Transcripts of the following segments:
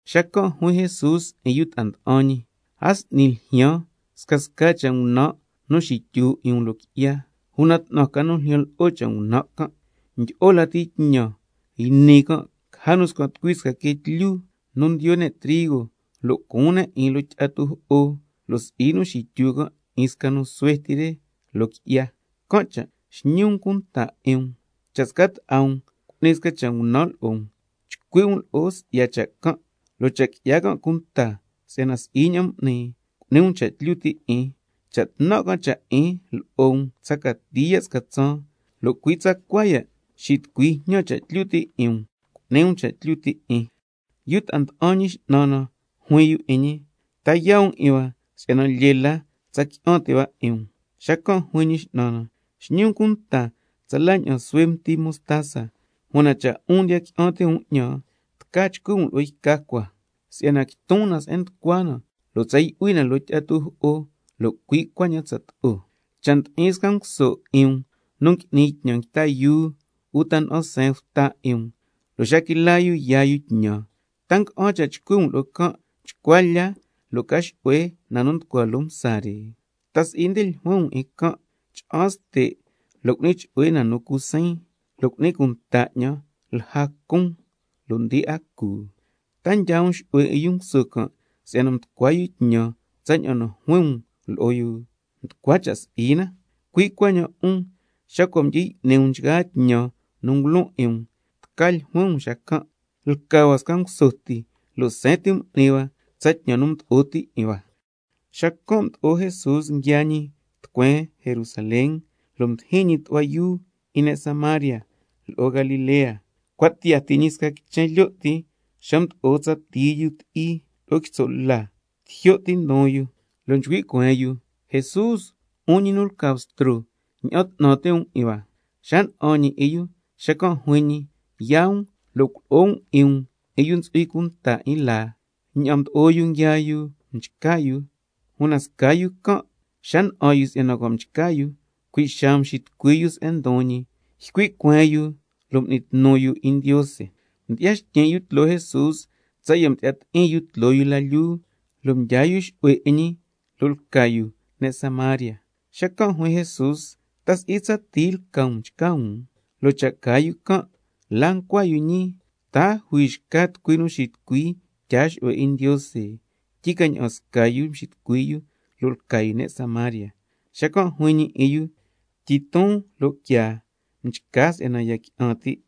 Xacan' juin Jesús 'in yu ta'a nda'an ñi: A s'ni ljyaan scasca cha' ngunan' nu xityu 'in um loo qui'ya, ¡una 'tnan ca nu ljyan lo'o cha' ngunan' can'! Ndyi'o la tñan yni can', caja nu scan' tucui sca quee tlyu nu ndiyo ne' trigo, lo' cuun ne' 'in loo tyi'a tujo'o, lo' si'i nu xityu can' 'in sca nu suhue ti re loo qui'ya. Can' cha' xñi um cunta 'in um. Cha' sca ta'a um cu'ni sca cha' ngunan' lo'o um, chcui' um lo'o si'ya cha' can', lo' cha' qui'ya can' cunta si'yana si'i ña'an m'ni, cu'ni um cha' tlyu ti' 'in. Cha' tnan' can' cha' 'in lo'o um tsa cati ya' sca tsaan, lo' cui' tsacua ya' xitucui jñan cha' tlyu ti' 'in um, cu'ni um cha' tlyu ti' 'in. Yu ta'a nda'an Ñi X'nan na juin yu 'in ñi: Ta yaa um 'in hua si'yana lyee la tsa qui'an ti' hua 'in um. Xacan' juin Ñi X'nan na: Xñi um cunta tsala ña'an suhue mti mostaza, una cha' 'un ndiya qui'an ti' um 'ñan, tca chcui' um lo'o yca cua si'yana quiton na se'en nducua na lo' tsa yu'hui na loo tyi'a tujo'o, lo' cui' cuaña'an tsato'o. Cha' ndi'in sca nguso 'in um nu ngui'ni tñan nguita yuu uta na'an seen yu bta 'in um, lo' xa quila yu yaa yu tñan, ¿ta nga'an cha' chcui' um lo'o can': Chcua lya lo' ca xu'hue na nu nducua loo msa re? ¿Ta si'i na nde ljuin um lo'o can': Cha'an ste' lo' cu'ni chu'hue na nu cu siin, lo' cu'ni cunta 'ñan lja nu cun, lo' ndi'a cu? ¿Ta ndyaa um xu'hue 'in yu nguso can' si'yana mducua yu tñan tsaña'an nu juin um lo'o yu? Nducua cha' si'i na. Cui' cuaña'an 'un, xa cua' mdyi y'ni um nchgaa tñan nu ngulon 'in um, tca ljuin um xacan': Lca hua sca nguso ti, lo' seen ti m'ni hua tsa tñan nu mdo'o ti 'in hua. Xacan' mdo'o Jesús nguiaa ñi tucueen Jerusalén, lo' mdijin ñi tu'hua yuu 'in ne' Samaria lo'o Galilea. Cua' tiyaa ti ñi sca quichen lyo' ti xa mdo'o tsa tii yu nu ti'i lo'o quitso' la, tijyo' ti ndon yu, lo' nchcui' cueen yu: ¡Jesús, 'un ñi nu lca Bstro, ña'an 'tnan ti' um 'in hua! Xa na'an ñi 'in yu, xacan' juin ñi: Yaa um lo' culo'o um 'in um 'in yu nu ntsu'hui cunta 'in laa, ña'aan mdo'o yu nguiaa yu, mchca yu. Una sca yu can' xa na'an yu si'yana cua' mchca yu, cui' xaa mxitucui yu se'en ndon ñi, ycui' cueen yu lo' m'ni tnu yu 'in Ndiose, mdyi'ya xtyin' yu tloo Jesús tsaya' mdyi'ya ti'in yu tloo yu la lyuu, lo' mdyaa yu xu'hue 'in ñi, lo' lca yu ne' Samaria. Xacan' juin Jesús: ¿Ta si'i tsa tii lca um nu mchca um? Lo' cha caa yu can', ¿la ncua yu ñii? ¿Ta a jui xca tucui nu xitucui tyaa xu'hue 'in Ndiose, tyi ca ña'an sca yu mxitucui yu, lo' lca yu ne' Samaria? Xacan' juin ñi 'in yu: Tyiton lo' quiaa, mchca si'yana ya qui'an ti'.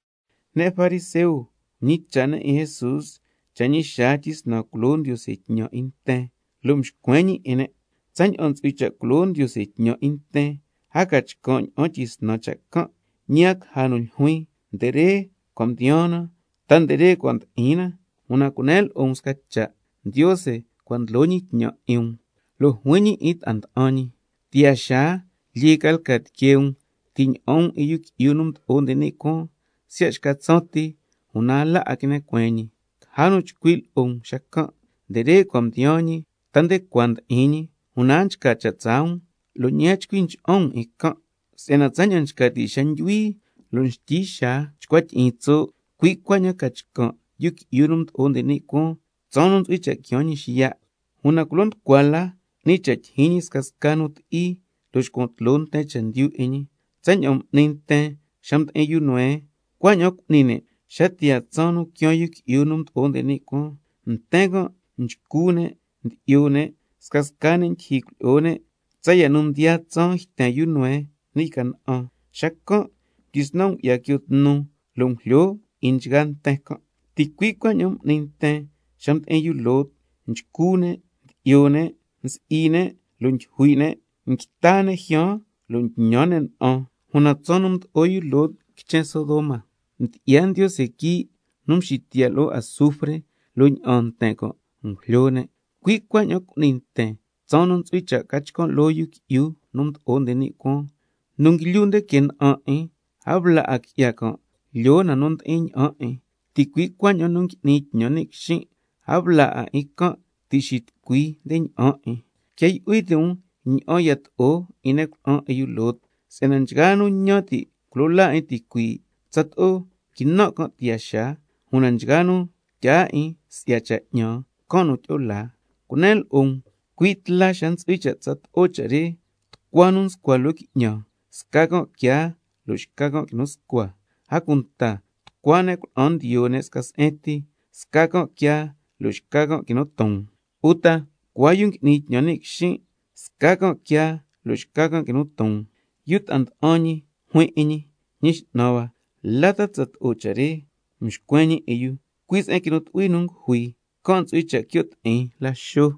Ne' fariseo mñicha' ne' 'in Jesús cha' ñi xaa tyisnan culo Ndiose tñan 'in nten, lo' mxcuen ñi 'in ne': Tsaña'an ntsu'hui cha' culo Ndiose tñan 'in nten, a ca chcan' ña'an tyisnan cha' can', ñi a caja nu ljuin: Nde re cua' mdiyaan na, ta nde cua ndi'in na. Una cunen lo'o um sca cha': Ndiose cua' ndlo ñi tñan 'in um. Lo' juin ñi 'in yu ta'a nda'an ñi: Tiyaa xaa, lyee ca lca tiquee um ti' ña'an um 'in Yu Qui'yu nu Mdo'o nde ni' Cuaan siya' xca tsaan ti, una a la a quine cueen ñi. Caja nu chcui' lo'o um xacan': Nde re cua' mdiyaan ñi, ta nde cua ndi'in ñi. Una a nchca cha' tsaa um, lo' ñi a chcui ncha'an um 'in can'. Si'yana tsaña'an nchca ti' xa ndyuhui lo' nxtyi xaa chcua tyi'iin tso', cui' cuaña'an ca chcan' Yu Qui'yu nu Mdo'o nde ni' Cuaan tsaan nu ntsu'hui cha' quiaan ñi xiya'. Una culo nducua la 'ni cha' tyijyin ñi scasca nu ti'i, lo' xcuan tloo nten chendyu 'in ñi. Tsaña'an m'ni nten xa mdi'in yu Noé, cui' cuaña'an cu'ni ne' xa tiyaa tsaan nu quiaan Yu Qui'yu nu Mdo'o nde ni' Cuaan. Nten can' nchcu ne', ndyi'yo ne', scasca ne' ndyija cuilyi'o ne' tsaya' nu mdiyaa tsaan yten yu Noé ni' yca na'an, xacan' mdyisnan ngu'ya quio tnu lo' ngujlyo na 'in nchgaa nten can'. Ticui' cuaña'an m'ni nten xa mdi'in yu Lot, nchcu ne', ndyi'yo ne', nsi'i ne' lo' ndyujui' ne' na, nguita ne' jyaan lo' ntñan ne' na'an, una tsaan nu mdo'o yu Lot quichen Sodoma, mdyi'ya Ndiose quii' nu mxitiya' lo'o azufre, lo' ña'aan nten can' ngujlyo ne'. Cui' cuaña'an cu'ni nten tsaan nu ntsu'hui cha' ca chcan' loo Yu Qui'yu nu Mdo'o nde ni' Cuaan. Xacan' yu nu ndlyu nde que na'an 'in, a bla 'a qui'ya can' lyoo na nu ndi'in ña'an 'in, ticui' cuaña'an lo'o yu nu ngui'ni tñan ni' quixin', a bla 'a can' ti' xitucui nde ña'an 'in. Quia yu'hui ti' um ña'an yato'o 'in ne' cuna'an 'in yu Lot. Si'yana nchgaa nu ñan ti' culo laa 'in ticuii', tsato'o quinan' can' tiyaa xaa, una nchgaa nu tyaa chendyu 'in 'ñan, can' nu tyi'o laa. Cunen lo'o um, cui' tla xa ntsu'hui cha' tsato'o cha' re, tucua nu nscua loo qui'ñan, sca can' quiaa lo' xca can' quinu scua. A cunta tucua ne' cuna'an nu ndiyo sca se'en ti, sca can' quiaa lo' xca can' quinu ton. Uta tucua yu nu ngui'ni tñan ni' quixin', sca can' quiaa lo' xca can' quinu ton. Yu ta'a nda'an ñi juin 'in ñi: Ñi X'nan hua, ¿la ta tsato'o cha' re? Xacan' mxcuen ñi 'in yu: Cui' se'en quinu tu'hui nu ngujui, can' ntsu'hui cha' quio' ti'in laxo.